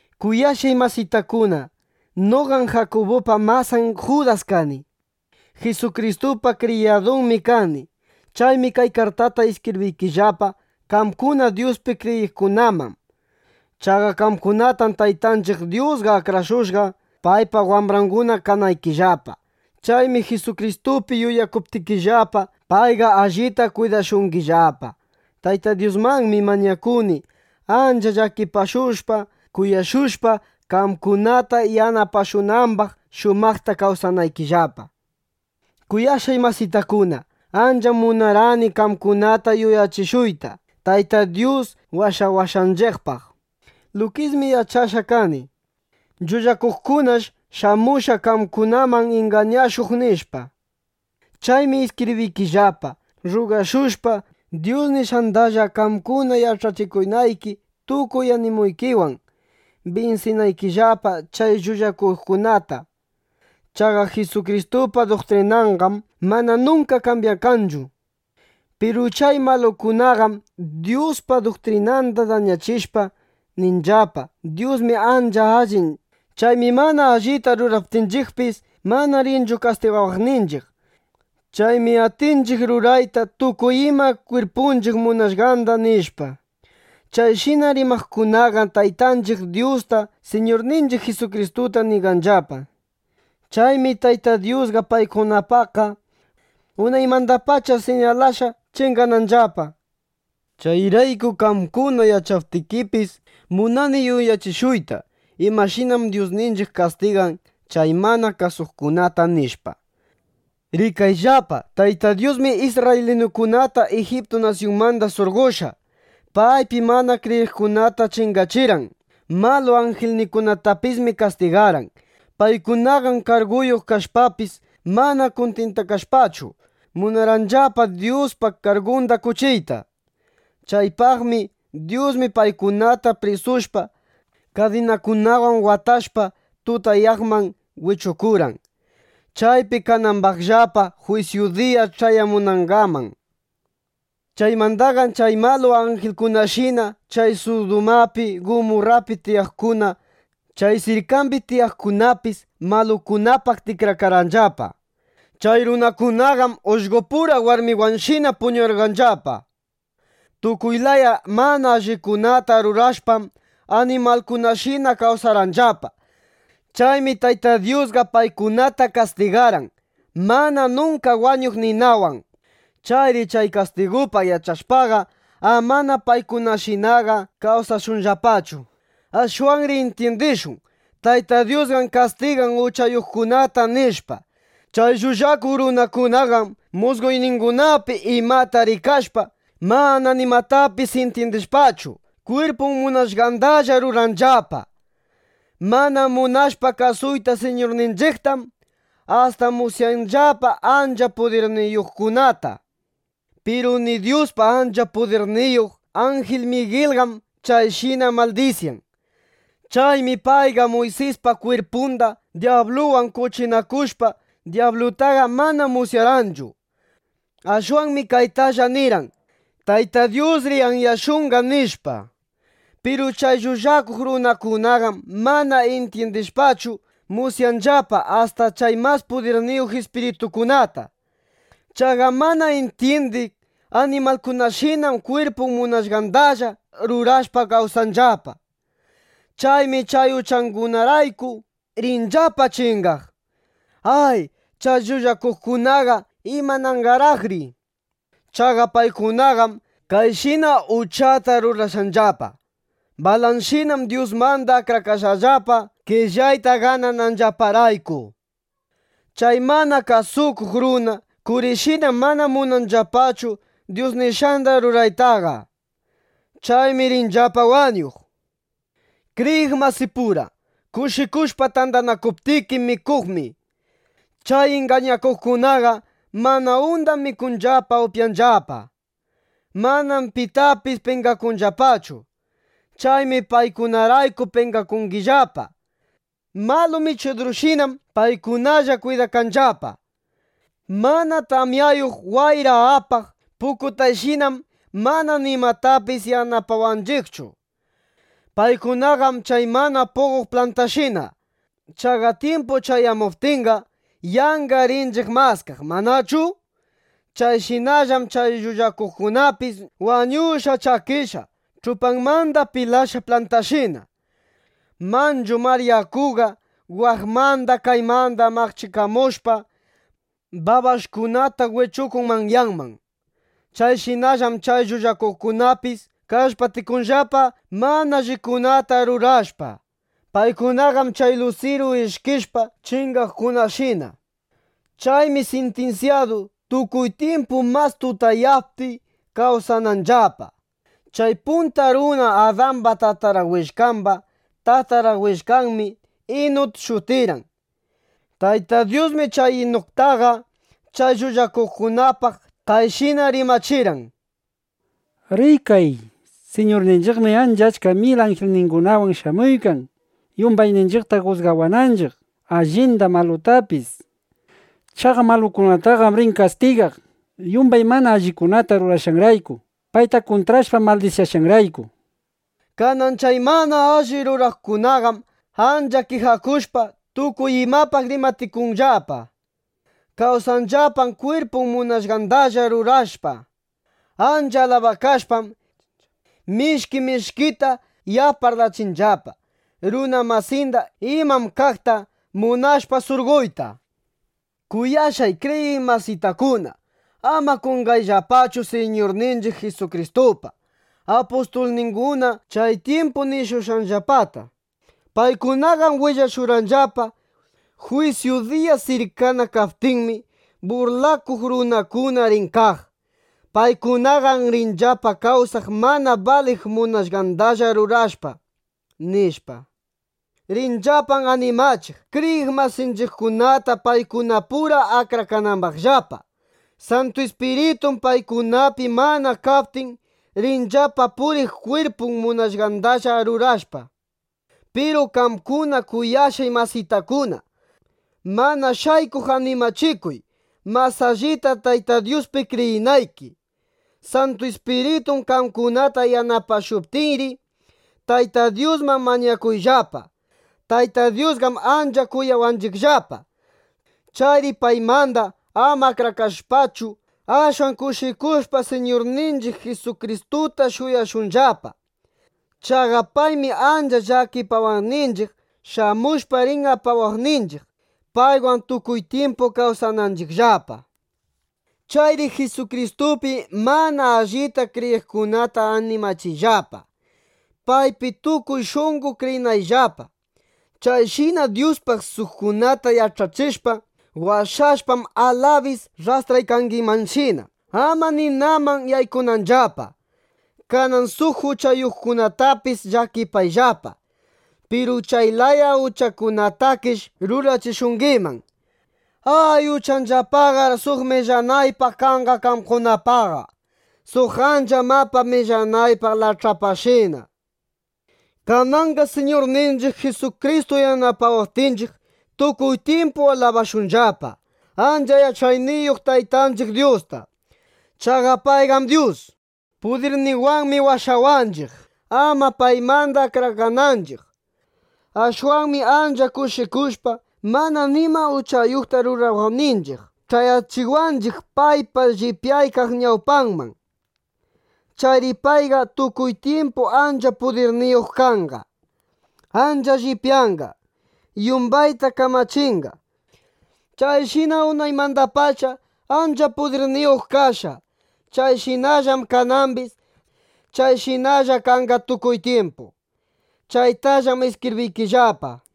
Kuyashqay masitakuna, noqam Jakubupa masan Judas kani. Jisukristupa kriyadunmi kani. Chaymi kay kartata iskibriykillapa qamkuna Dyuspi kriyiqkunaman. Chaqa qamkunatam Taytanchiq Dyusqa akrashushqa, paypa wambranguna kanaykillapa. Chaymi Jisukristupi yuyakuptikillapa, payqa allita kwidashungillapa. Tayta Dyusmanmi mañakuni, ancha llakipashushpa, kuyashushpa, qamkunata yanapashunambaq, shumaqta kawsanaykillapa. Kuyashqay masitakuna, ancham munarqani qamkunata yuyachishuyta Tayta Dyus washawashqanchiqpaq. Lukismi yach'ashqa kani: Llullakuqkunash shamushqa qamkunaman ingañashuq, nishpa. Chaymi iskibriykillapa rrugashushpa Dyus nishqandalla qamkuna yach'achikunayki tukuy animuykiwan, binsinaykillapa chay llullakuqkunata. Chaqa Jisukristupa duktrinanqam mana nunka kambyakanchu. Piru chay malukunaqam Dyuspa duktrinanda dañachishpa, ninllapa: “Dyusmi ancha allin. Chaymi mana allita ruraptinchiqpis, mana rinchu kastigawaqninchiq. Chaymi atinchiq rurayta tukuy ima kwirpunchiq munashqanda”, nishpa. Chayshina rimaqkunaqam Taytanchiq Dyusta, Siñurninchiq Jisukristuta ñiganllapa. Chaymi Tayta Dyusqa paykunapaqqa unaymandapacha siñalashqa chingananllapa. Chayraykum qamkuna yach'aptikipis, munani yuyachishuyta imashinam Dyusninchiq kastigan chay mana kasuqkunata, nishpa. Rikayllapa, Tayta Dyusmi isrraylinukunata Ijiptu nasyunmanda surqoshpa, paypi mana kriyiqkunata chingachirqan. Malu anjilkunatapismi kastigarqan. Paykunaqam karguyuq kashpapis, mana kuntintakashpachu, munarqanllapa Dyuspa kargunda qoch'iyta. Chaypaqmi Dyusqa paykunata prisushpa, kadinakunawan watashpa, tutayaqman wichukurqan, chaypi kanambaqllapa jwisyu diya ch'ayamunangaman. Chaymandaqam chay malu anjilkunashina chay Sudumapi, Gumurrapi tiyaqkuna, chay sirkambi tiyaqkunapis malukunapaq tikrakarqanllapa. Chay runakunaqam ullqopura warmiwanshina puñurqanllapa. Tukuy laya mana allikunata rurashpam, animalkunashina kawsarqanllapa. Chaymi Tayta Dyusqa paykunata kastigarqan mana nunka wañuq ninawan. Chayri chay kastigupaq yach'ashpaqa, amana paykunashinaqa kawsashunllapachu. Ashwanri intyindishun: Tayta Dyusqam kastigan uchayuqkunata, nishpa. Chay llullakuq runakunaqam musqoyningunapi imata rikashpa, mana nimatapis intyindishpachu, kwirpun munashqandalla ruranllapa. Mana munashpa kasuyta Siñurninchiqtam, asta musyanllapa ancha pudirniyuqkunata. Piru ni Dyuspa ancha pudirniyuq anjil Migilqam chayshina maldisyan. Chaymi payqa Muysispa kwirpunda dyabluwan qoch'inakushpa, dyablutaqa mana musyarqanchu. Ashwanmi kaytalla nirqan: “¡Tayta Dyusri anyashunqa!” nishpa. Piru chay llullakuq runakunaqam mana intyindishpachu, musyanllapa asta chay mas pudirniyuq ispiritukunata. Chaqa mana intyindiq animalkunashinam kwirpun munashqandalla rurashpa kawsanllapa. Chaymi chay uchangunarayku rinllapa chingaq. ¡Ay, chay llullakuqkunaqa, imananqaraqri! Chaqa paykunaqam Kayinshina uchata rurashqallapa. Balanshinam Dyusmanda akrakashqallapa, qellayta ganananllaparayku. Chay mana kasukuq runa Kurishinam mana munanllapachu Dyus nishqanda ruraytaqa. Chaymi rinllapa wañuq. Kriyiq masipura kushikushpa tandanakuptiki mikuqmi, chay ingañakuqkunaqa mana undaq mikunllapa, upyanllapa. Manam pitapis penqakunllapachu. Chaymi paykunarayku penqakungillapa. Malu michidurshinam paykunalla kwidakanllapa. Mana tamyayuq wayra apaq pukutayshinam mana nimatapis yanapawanchiqchu. Paykunaqam chay mana puqoq plantashina. Chaqa tyimpun ch'ayamuptinqa, yanqa rinchiq maskaq, ¿manachu? Chayshinallam chay llullakuqkunapis wañushqa, chakishqa, ch'upanmanda pilashqa plantashina. Manchu mar yakuqa waqmanda kaymanda maqchikamushpa, babash'kunata wichukun manyaman. Chayshinallam chay llullakuqkunapis kallpatikunllapa, mana allikunata rurashpa. Paykunaqam chay lusiru ishkishpa chingaqkunashina. Chaymi sintinsyadu, tukuy tyimpu mas tutayaqpi kawsananllapa. Chay punta runa Adamba tatara willkamba tatara willkanmi Inuk shutirqan. Tayta Dyusmi chay Inuktaqa chay llullakuqkunapaq kayshina rimachirqan: —¡Rikay! Siñurninchiqmi ancha achka mil anjilningunawan shamuykan, yumbayninchiqta jusgawananchiq, allinda, malutapis. Chaqa malukunataqam rin kastigaq, yumbay mana allikunata rurashqanrayku, payta kuntrashpa, maldisyashqanrayku, nishpa. Kanan chay mana alli ruraqkunaqam ancha kijakushpa, tukuy imapaq rimatikunllapa. Kawsanllapam kwirpun munashqandalla rurashpa. Ancha alabakashpam, mishki mishkita yap parlachinllapa runa masinda, iman kaqta munashpa surqoyta. Kuyashqay kriyiq masitakuna, ama qonqayllapachu Siñurninchiq Jisukristupa apustulninguna chay tyimpu nishushqanllapata. Paykunaqam willashurqanllapa: “Jwisyu diya sirkana kaptinmi, burlakuq runakuna rin kaq. Paykunaqam rinllapa kawsaq mana baliq munashqandalla rurashpa”, nishpa. Rinllapam animachiq kriyiq masinchiqkunata, paykunapura akrakananllapa. Santu Ispiritum paykunapi mana kaptin, rinllapa puriq kwirpun munashqandalla rurashpa. Piru qamkuna, kuyashqay masitakuna, mana shaykuq animachikuy, mas allita Tayta Dyuspi kriyinayki. Santu Ispiritun qamkunata yanapashuptinri, Tayta Dyusman mañakuyllapa. Tayta Dyusqam ancha kuyawanchiqllapa. Chayri paymanda ama akrakashpachu, ashwan kushikushpa Siñurninchiq Jisukristuta shuyashunllapa. Chaqa paymi ancha llakipawaqninchiq, shamushpa rin apawaqninchiq, paywan tukuy tyimpu kawsananchiqllapa. Chayri Jisukristupi mana allita kriyiqkunata animachiyllapa, paypi tukuy shunqo kriyinanllapa. Chayshina Dyuspaq suqkunata yach'achishpa, washashpam, alabis rrastraykangimanshina, ama ninaman yaykunanllapa. Kanan suq uchayuqkunatapis llakipayllapa. Piru chay laya uchakunatakish rurachishungiman. Ay, uchanllapaqar suq millanaypaq kanqa qamkunapaqqa, suq ancha mapa millanaypaq lach'apashina. Kananqa ˻Siñurninchiq Jisukristu yanapawaptinchiq˼ tukuy tyimpu alabashunllapa ancha yach'ayniyuq Taytanchiq Dyusta. Chaqa payllam Dyus. Pudirninwanmi washawanchiq, ama paymanda akrakananchiq. Ashwanmi ancha kushikushpa, mana nima uchayuqta rurawaqninchiq, ch'ayachiwanchiq paypa llipyaykaq ñawpanman. Chayri payqa tukuy tyimpu ancha pudirniyuq kanqa. Ancha llipyanqa. Yumbayta kamachinqa. ¡Chayshinam unaymandapacha ancha pudirniyuq kashqa! ¡Chayshinallam kanambis! ¡Chayshinalla kanqa tukuy tyimpu! (Chaytallam iskibriykillapa.)